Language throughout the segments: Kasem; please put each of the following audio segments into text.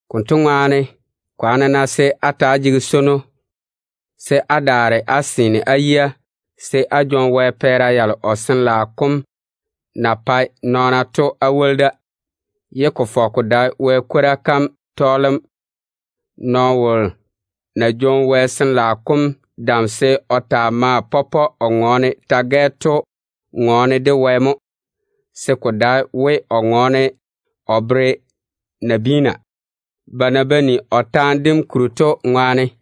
Konto ŋwaane, kwaane-na se á ta‑á jege swono, se á daare á seene á yia se á jwoŋi Wɛ pɛɛra yalo o Sin-laao kom na pae nɔɔna to á woli da, ye ko fɔge ko dae Wɛ kwora kam tɔɔlem. Nɔɔno wolo ná jwoŋi Wɛ Sin-laao kom dam se o taa maa pɔpɔe o ŋɔɔne ta-gɛ, kotu ŋɔɔne de Wɛ mo. Ko dae we o ŋɔɔne o bere nabiina, ba na ba ni o taane dem kuri to ŋwaane. Wɛ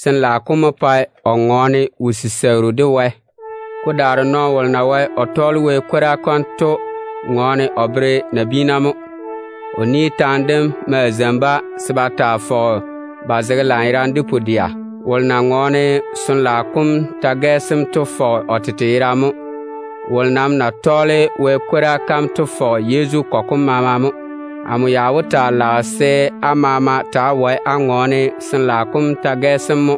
Sin-laao kom mo pae o ŋɔɔne wo-siseigiru. Ko daare nɔɔno wolo na wae o tɔɔle Wɛ kwora kam to ŋɔɔne o bere nabiina mo. O ni taane dem maa zeini-ba se ba taa fɔge ba zege lanyerane de pu-dɛa. Wolo na ŋɔɔne Sin-laao kom ta-gɛ sem to fɔge o tete mo. Wolo nam na tɔɔle Wɛ kwora kam to fɔge Yezu kɔgɔ kom maama mo. Amo ya wó taa lage se á maama taa wae á ŋɔɔne Wɛ Sin-laao kom ta-gɛ mo,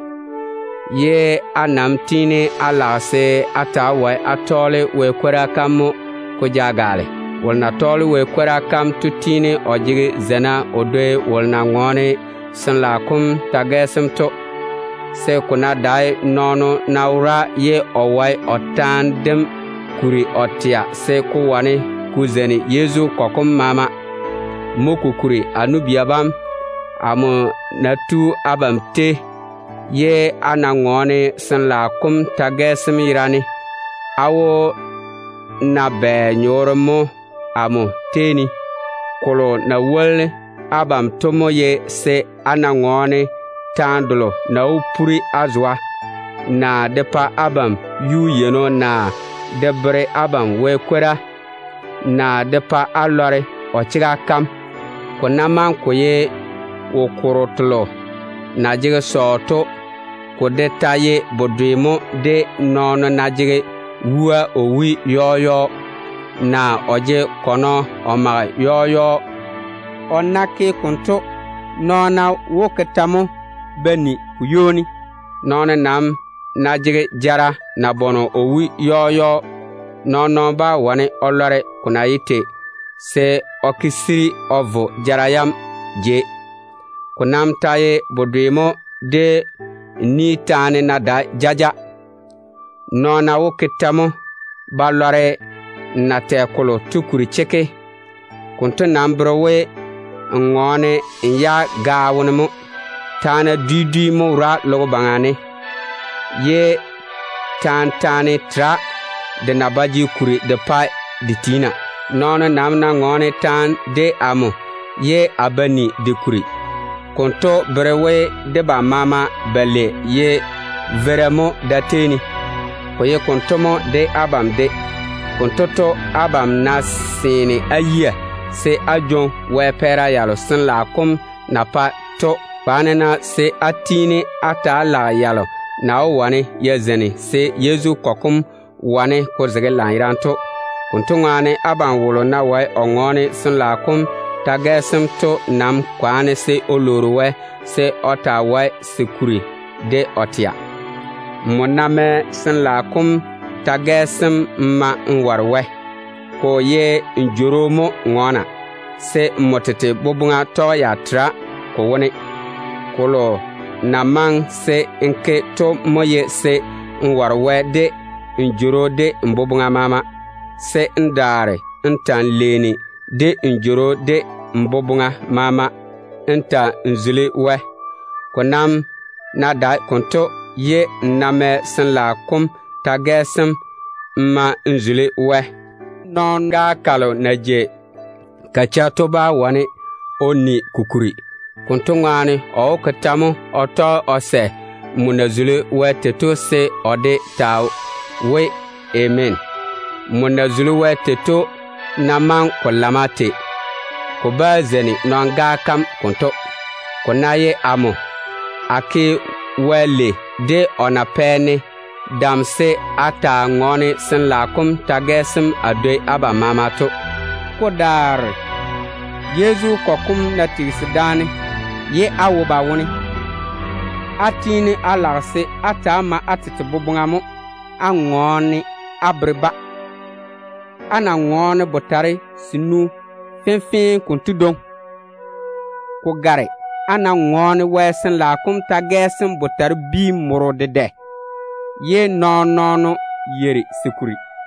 ye a nam tiini a lage se á ta‑á wae á tɔɔle Wɛ kwora kam mo ko ja gaale. Wolo na tɔɔle Wɛ kwora kam to tiini o jege zeina o dwoi wolo na ŋɔɔne Sin-laao kom ta-gɛ sem to, se ko ná dae nɔɔno ná wora ye o wae o taane dem kuri o tɛa, se ko wane ko zeini Yezu kɔgɔ kom maama. Mo kokuri, a nu-bia bam, amo ná tu abam tei, ye a ná ŋɔɔne Sin-laao kom ta-gɛ yerane, á wó na bɛ nyɔɔre mo amo tei ne? Kolo na wó woli abam to mo ye se a ŋɔɔne taane delo Wɛ na le o bere-ne to, naa de pa abam yuu-yeino, naa de bere abam Wɛ kwora, naa de pa á lɔre o chega kam. Ko ná maŋe ko ye wo-korro telo na jege sɔɔ to, ko de ta ye bedwe mo de nɔɔno ná jege wua o wui yɔɔ yɔɔ, naa o jege kɔnɔ o tae yɔɔ yɔɔ. O ná ke konto, nɔɔna wó ke tɛ mo ba ni ko ywoni? Nɔɔno ná jege jara nabɔnɔ o wui yɔɔ yɔɔ, nɔɔn-nɔɔno bá wane o lɔre ko na ye tei, se o chichei o zege jara ŋwaane. Ko nam ta ye bedwe mo de n ni taane ná dae jaja, nɔɔna wó ke tɛ mo ba lɔre n na tɛ kolo to kuri chekke? Konto nam bere we n ŋɔɔne n yage gaao wone mo. Taana dwi dwi mo wora logo baŋa ne, ye taan-taane tera de na ba jege kuri de pa de tiina. Nɔɔno nam ná ŋɔɔne taane de amo ye a ba ni de kuri, konto bere we debam maama balei ye veira mo da-tei ne. Ko ye konto mo de abam de. Abam ná seene á yia se á jwoŋi Wɛ pɛɛra yalo Sin-laao kom na pae to, kwaane-na se á tiini á ta‑á lage yalo na wó wane ya zeini se Yezu kɔgɔ kom wane ko zege lanyerane to. Konto ŋwaane, abam wolo ná wae o ŋɔɔne Sin-laao kom ta-gɛ, kotu nam lwoori Wɛ se o taa wae se kuri de o tɛa. Nmo ná mɛ Wɛ Sin-laao kom ta-gaa n ma n ware Wɛ, ko ye n jworo mo ŋɔɔna, se nmo tete boboŋa tɔge ya tere ko wone. Kolo na maŋe se n ke to mo ye se n yeini n ware Wɛ de n jworo de n boboŋa maama, se n daare n ta‑n leeni de n jworo de n boboŋa maama n seini Wɛ. Ko nam ná dae konto, ye n ná mɛ Sin-laao kom ta-gaa n ma n zuli Wɛ n jworo wone, nɔɔna balo na jei ba cheigi to bá wane ba ni ko kuri. Konto ŋwaane, ba wó ke tɛ mo ba tɔge ba sɛ nmo na ke Wɛ lei tei to se ba de ta we, “Ameena”? Nmo na ke Wɛ lei tei to ná maŋe ko lamma tei, ko bá zeini balo na jei ba cheigi to. Ko ná ye amo, a ke Wɛ lei de o na pɛ-ne dam se a taa ŋɔɔne Sin-laao kom ta-gɛ a dwoi abam maama to. Ko daare Yezu kɔgɔ kom ná tigisi daane ye a wo ba wone, a tiini a lage se a taa mae a tete boboŋa mo a ŋɔɔne a bere-ba. A ná ŋɔɔne botare senu fenfee konto dwoŋi, ko gare a ná ŋɔɔne Wɛ Sin-laao kom ta-gaa botare-bia morro dedɛ ye nɔɔn-nɔɔno yeiri se kuri.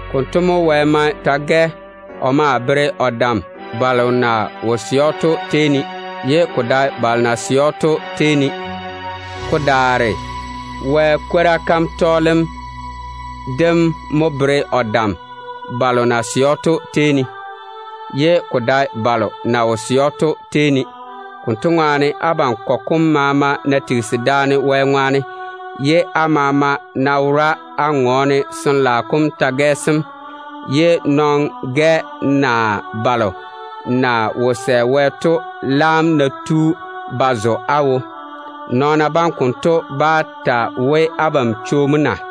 Konto mo Wɛ mae ta-gɛ o maa bere o dam balo na wo sɛ‑o to tei ne, ye ko dae balo na sɛ‑o to tei ne. Ko daare Wɛ kwora kam tɔɔlem dem mo bere o dam balo na sɛ‑o to tei ne, ye ko dae balo na wo sɛ‑o to tei ne. Konto ŋwaane, abam kɔgɔ kom maama ná tigisi daane Wɛ zula ŋwaane, ye á maama ná wora á ŋɔɔne ta-gɛ, ye veira badwonna naa balo na wo sɛ Wɛ to laam ná tu ba zo á wo, nɔɔna bam konto bá ta we, abam yirisi mo na?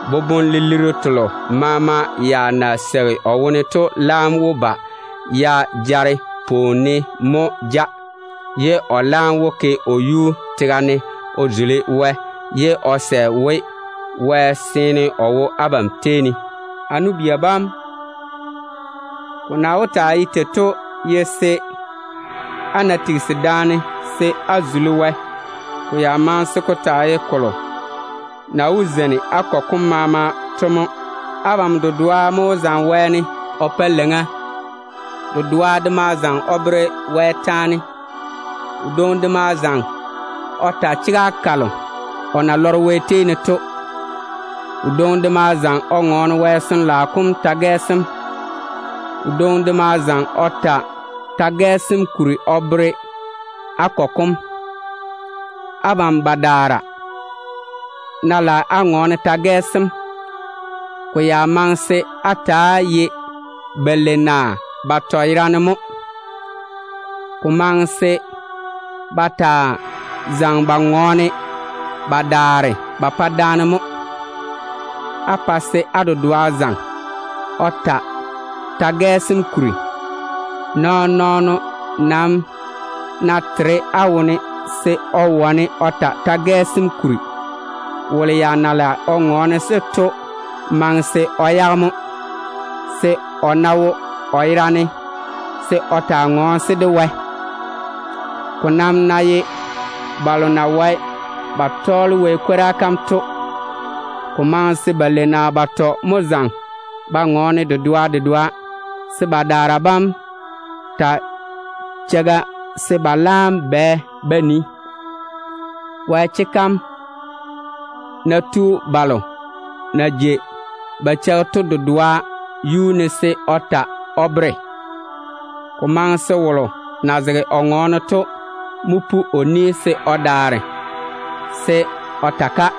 Boboŋ-lilirru telo maama ya na seigi o wone to laam wó ba ya jare pwooni yiga ne mo ja. O maa wó vwi o yibia tega ne o zuli Wɛ, ye o sɛ we, Wɛ seene o wo á tei ne. A nu-bia bam, dé daa ta wó ta bɛ mo de abam? Á ná tigisi daane se á zuli Wɛ, ko ya maŋe se ko taa ye kolo na wó zeini á kɔgɔ kom maama to mo. Abam dedoa mo wó zaŋe wɛɛne o mɔ leiŋa. Dedoa de maa wó zaŋe o bere Wɛ taane. Wodwoŋi de maa wó zaŋe o ta chega kalo Wɛ na le o bere‑o to. Wodwoŋi de maa wó zaŋe o ŋɔɔne Wɛ Sin-laao kom ta-gaa. Wodwoŋi de maa wó zaŋe o ta ta-gaa kam kuri o bere á kɔgɔ kom. Abam badaara ná lage á pɔpɔ á ŋɔɔne ta-gɛ, ko maŋe se á ta‑á ye balei naa batɔ yerane mo. Ko maŋe se á ta‑á zaŋe á ŋɔɔne á daare á pa daane mo, se á dedoa zaŋe o ta ŋwɛ sem kuri. Nɔɔn-nɔɔno nam ná tere á wone se o wane o ta ta-gɛ sem kuri, wolo ya na lage o ŋɔɔne-se to maŋe se o yage mo, se o ná wo o yerane, se o taa ŋɔɔne-se de Wɛ. Ko nam ná ye Wɛ ni-jwoŋina balo na wae ba tɔɔle o kwora kam to, ko maŋe se balei naa batɔ mo zaŋe ba ŋɔɔne dedoa dedoa, se badaara bam taa cheiga se ba laam bwɛ ba nii. Wɛ chega kam ná tu balo na jei ba cheigi to dedoa yuu ne se o ta o bere, ko maŋe se wolo na zege o ŋɔɔne to mo pu o ni se o dwoŋi wom ta-ka.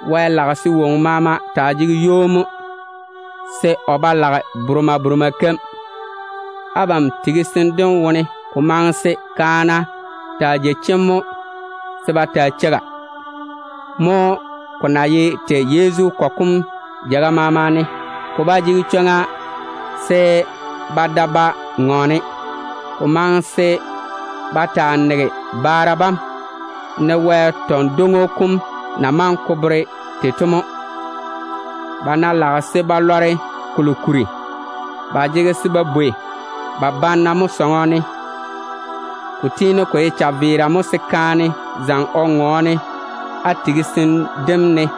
Wɛ lage se woŋo maama taa jege ywoni mo, se o ba lage boremaa boremaa keim. Abam ná tigisi daane wɛ-di sem wone, ko maŋe se kaana taa jei chemm mo se ba taa cheiga. Mo ko na ye tei Yezu kɔgɔ kom jeiga maama ne. Ba ba jege chwoŋa se ba da ba ŋɔɔne. Ko maŋe se ba taa tu ba tete tega ne, ne Wɛ tɔn-dwoŋo kom na maŋe ko bere tei to mo. Ba ná lage se ba lɔre kolo kuri, ba jege se ba bwei ba banna mo sɔŋɔ ne. Ko tiini ko ye chaveera mo se kaane zaŋe o ŋɔɔne á tigisim dem ne.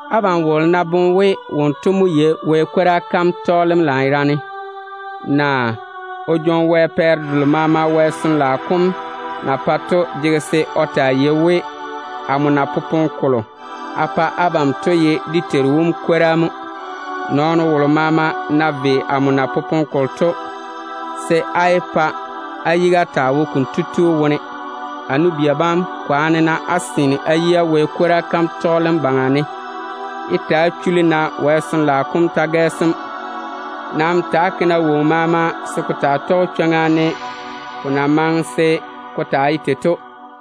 Abam wolo ná boŋe we o Wɛ ni-jwoŋinu, naa o boboŋa kweere Wɛ Sin-laao kom pɛɛra seeni, kotu jege se o taa yei we, amo na popone kolo a pa abam to ye dé Teiru wom kwora mo. Nɔɔno wolo maama ná ve amo ni dem konto, se á yé pa á yiga taa wo konto tu wone. A nu-bia bam, kwaane-na á seene á yia Wɛ kwora kam tɔɔlem baŋa ne. Yé ta‑á chuli-na Sin-laao kom ta-gɛ sem ŋɔŋa. Nam ta‑á ke-na woŋo maama se ko taa tɔge chwoŋa, ne ko na maŋe se ko taa ye tei to.